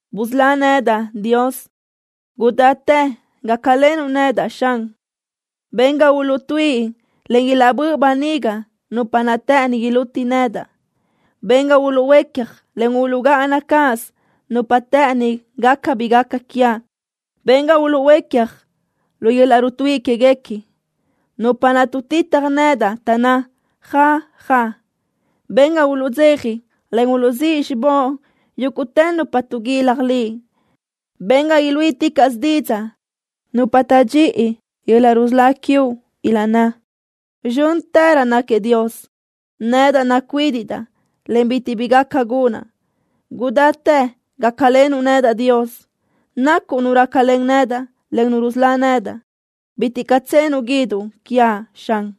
¡Busölá nedaʼ, Dios! ¡Gudáchi gácalenuʼ nedaʼ, Xan! Ben ga uluʼtuíʼi, en ilaʼbö́ʼ böniga nupa naʼ të́ʼëni iluti nedaʼ. Ben ga uluʼhuécja, en uluʼgáʼana cáʼasö nupa naʼ të́ʼëni gaca bi gaca quiaʼ. Ben ga uluʼhuécja lu yöl-laʼ rutuíʼi quéguequi nupa naʼ tuʼtitaj nedaʼ, taʼnná: “Ja, ja.” Ben ga uluʼdzeja, en uluʼzíʼ xibóʼ yúguʼtë nupa tuʼguilaj Liʼ. Ben ga iluíʼiticaʼsö didzaʼ nupa taʼdxíʼi yöl-laʼ rusölá quiuʼ, ilaʼnná: “¡Zxö́ntërö náquiëʼ Dios!” Nedaʼ nacuídiʼdaʼ, en bitiʼ bi gaca gunaʼ. ¡Gudáchi gácalenuʼ nedaʼ, Dios! Nacuʼ Nu rácalen nedaʼ, en Nu rusölá nedaʼ. ¡Bitiʼ caʼ tsenuʼ guíduʼ quiaʼ, Xan!